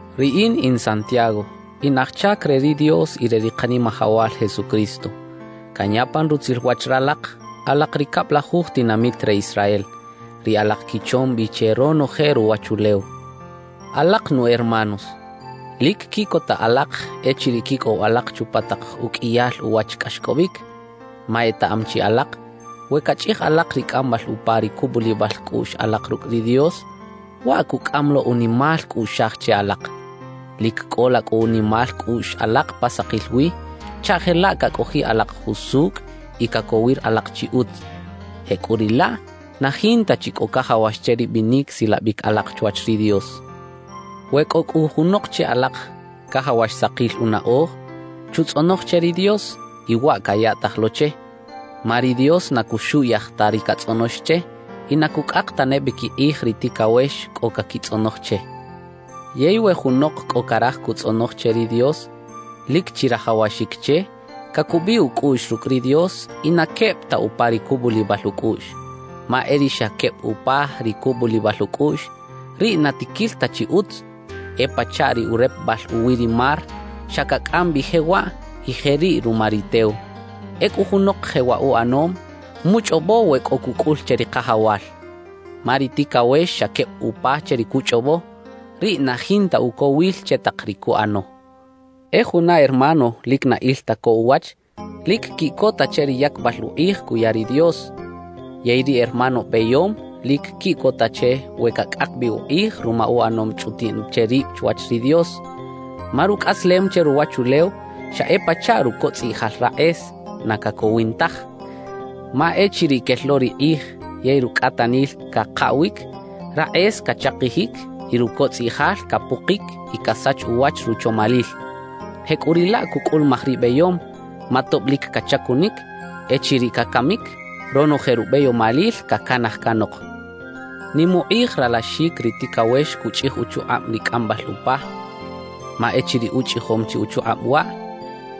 Riꞌin in Santiago, in aj chac re ri Dios y re ri Kanimajawal Jesucristo. Canya pan rutzil wach ralak alak ri cablajuj tinamit re Israel, ri alak quichom bi che ronoje ruwachulew. Alak nu hermanos, lic quiꞌcota alak echiriꞌ quicꞌow alak chupa tak uqꞌuiyal uwach cꞌaxcꞌobic. Ma etaꞌam chi alak we cachꞌij alak ri cꞌambal upa ri cubulibal cꞌuꞌx alak rucꞌ ri Dios, waꞌ cucꞌam lo unimal cꞌuꞌxaj che alak. Lic cꞌola cꞌu unimal cꞌuꞌx alak pa sakil wi chaꞌ jelaꞌ cacꞌojiꞌ alak jusucꞌ y cacowir alak chi utz, jecꞌuriꞌlaꞌ na jinta chi cꞌo cajawax che ri binic silabic alak chwach ri Dios. We cꞌo cꞌu junok che alak cajawax sakil unaꞌoj, chutzꞌonoj che ri Dios y waꞌ cayaꞌtaj lo che, ma ri Dios na cuxuꞌyaj ta ri catzꞌonox che y na cucꞌak tane bi quikꞌij ri ticawex cꞌo caquitzꞌonoj che. Yey we junok cꞌo caraj cutzꞌonoj che ri Dios, lic chirajawaxic che, cacubiꞌ ucꞌuꞌx rucꞌ ri Dios y na queb ta upa ri cubulibal ucꞌuꞌx. Ma e ri xa queb upa ri cubulibal ucꞌuꞌx, riꞌ na tiquil ta chi utz; e pachaꞌ ri urepebal uwi ri mar xa cacꞌam bi jewaꞌ y jeriꞌ ruma ri tew. Ecꞌu junok jewaꞌ uꞌanom, muchꞌobo we cꞌo cucꞌul che ri Kajawal. Ma ri ticawex xa queb upa che ri cuchꞌobo, riꞌ na jinta ucowil che tak ri cuꞌano. E juna hermano lic na il ta co uwach, lic quiꞌcota che ri yacbal ukꞌij cuya ri Dios. Yey ri hermano beyom lic quiꞌcota che we cacꞌak bi ukꞌij ruma uꞌanom chꞌutiꞌn che rib chwach ri Dios. Ma rucꞌaslem che ruwachulew xa e pachaꞌ rucotzꞌiꞌjal rakꞌes, na cacowin taj. Ma echiriꞌ quel lo ri kꞌij yey rucꞌatanil cakaꞌwic, rakꞌes cachakijic y rucotzꞌiꞌjal capukic y casach uwach ruchomalil. Jecꞌuriꞌlaꞌ cucꞌulumaj ri beyom, ma tob lic cachacunic, echiriꞌ cacamic, ronoje rubeyomalil cacanaj canok. Nim ukꞌij ralaxic ri ticawex cuchꞌij uchukꞌab ri cꞌambal upa, ma echiriꞌ uchꞌijom chi uchukꞌab waꞌ,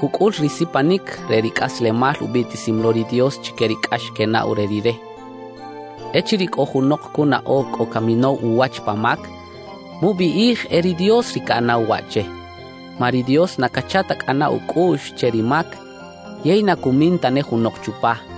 cucꞌul ri sipanic re ri cꞌaslemal ubiꞌtisim lo ri Dios chique ri cꞌax quenaꞌw re Rire. Echiriꞌ cꞌo junok cunaꞌo cꞌo caminow uwach pa mac, mubiꞌij e ri Dios ri caꞌanaw waꞌ che. Ma ri Dios na cacha ta cꞌana ucꞌuꞌx che ri mac yey na cumin tane junok chupa.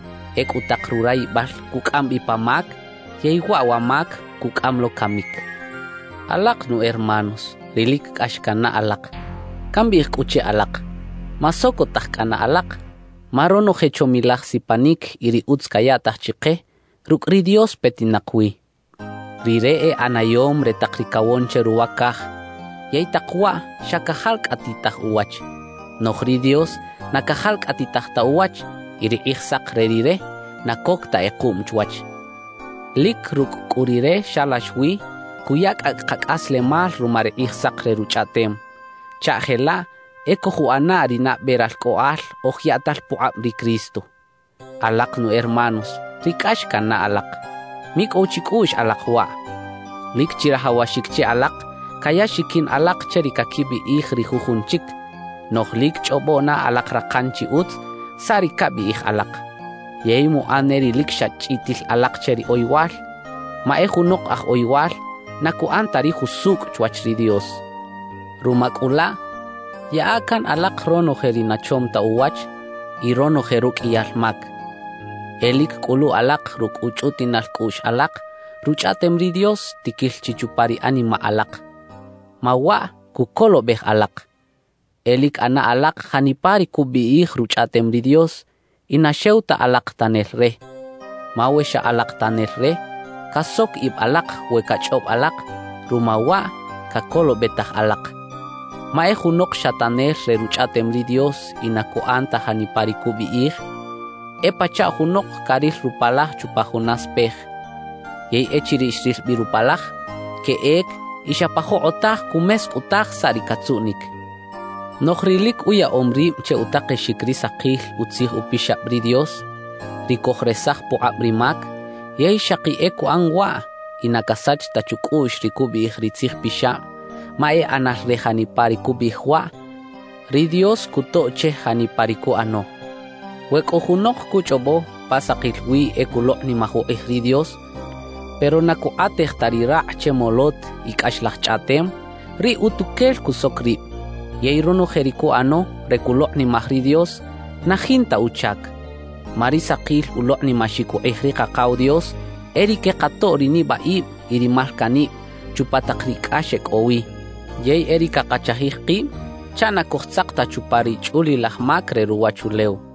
Ecꞌu tak rurayibal cucꞌam bi pa mac, yey waꞌ wa mac cucꞌam lo camic. Alak nu hermanos ri lic cꞌax cannaꞌ alak, cambiꞌij cꞌu che alak: Masocotaj cꞌana alak. Ma ronoje chomilaj sipanic y ri utz cayaꞌtaj chike, rucꞌ ri Dios petinak wi. Rire e ꞌanayom re tak ri cawon che ruwa caj. Yey tak waꞌ xa cajalcꞌatitaj uwach, noꞌj ri Dios na cajalcꞌatitaj ta uwach y ri kꞌijsak re Rire na coc ta kꞌekuꞌm chwach. Lic rucꞌ cꞌu Rire xalax wi cuya cꞌacꞌ kacꞌaslemal ruma ri Kꞌijsak re Ruchꞌaꞌtem, chaꞌ jelaꞌ e cojuꞌana ri nabe ralcꞌoꞌal oj yaꞌtal pukꞌab ri Cristo. Alak nu hermanos ri cꞌax cannaꞌ alak, micꞌow chicꞌuꞌx alak waꞌ: Lic chirajawaxic che alak caya xiquin alak che ri caquibiꞌij ri jujun chic, noꞌj lic chꞌobo na alak rakan chi utz saꞌ ri cabiꞌij alak, yey muꞌan ne ri lic xa chꞌitil alak che ri oyowal. Ma e junok aj oyowal na cuꞌan ta ri jusucꞌ chwach ri Dios. Ruma cꞌu laꞌ, yaꞌa can alak ronoje ri na chom ta uwach y ronoje ruqꞌuiyal mac. E lic cꞌulu alak rucꞌ uchꞌutiꞌnal cꞌuꞌx alak Ruchꞌaꞌtem ri Dios tiquil chi chupa ri animaꞌ alak, ma waꞌ cucolobej alak. E lic ꞌana alak janipa ri cubiꞌij Ruchꞌaꞌtem ri Dios y na xew ta alak tanel re; ma we xa alak tanel re, casoc ib alak we cachꞌob alak ruma waꞌ cacolobetaj alak. Ma e junok xa tanel re Ruchꞌaꞌtem ri Dios y na cuꞌan ta janipa ri cubiꞌij, e pachaꞌ junok caril rupalaj chupa juna spej. Yey echiriꞌ xril bi rupalaj, queꞌec y xa pa jokꞌotaj cumescꞌutaj saꞌ ri catzuꞌnic. Noꞌj ri lic uyaꞌom rib che utakexic ri sakil Utzij Upixab ri Dios, ri cojresaj pukꞌab ri mac, yey xaki e cuꞌan waꞌ y na casach ta chucꞌuꞌx ri cubiꞌij ri Tzij Pixab ma e ꞌanal re janipa ri cubiꞌij waꞌ, ri Dios cutoꞌ che janipa ri cuꞌano. We cꞌo junok cuchꞌobo pa sakil wi e culokꞌnimaj ukꞌij ri Dios, pero na cukꞌatej ta ri rakꞌ che molot y cꞌaxlaj chꞌaꞌtem, riꞌ utuquel cusoc rib yey ronoje ri cuꞌano re culokꞌnimaj ri Dios, na jinta uchac. Ma ri sakil ulokꞌnimaxic ukꞌij ri Kakaw Dios e ri quekatoꞌ ri nibaꞌib y ri malcaꞌnib chupa tak ri cꞌax e cꞌo wi, yey e ri cakachajij kib chaꞌ na cojtzak ta chupa ri chꞌulilaj mac re ruwachulew.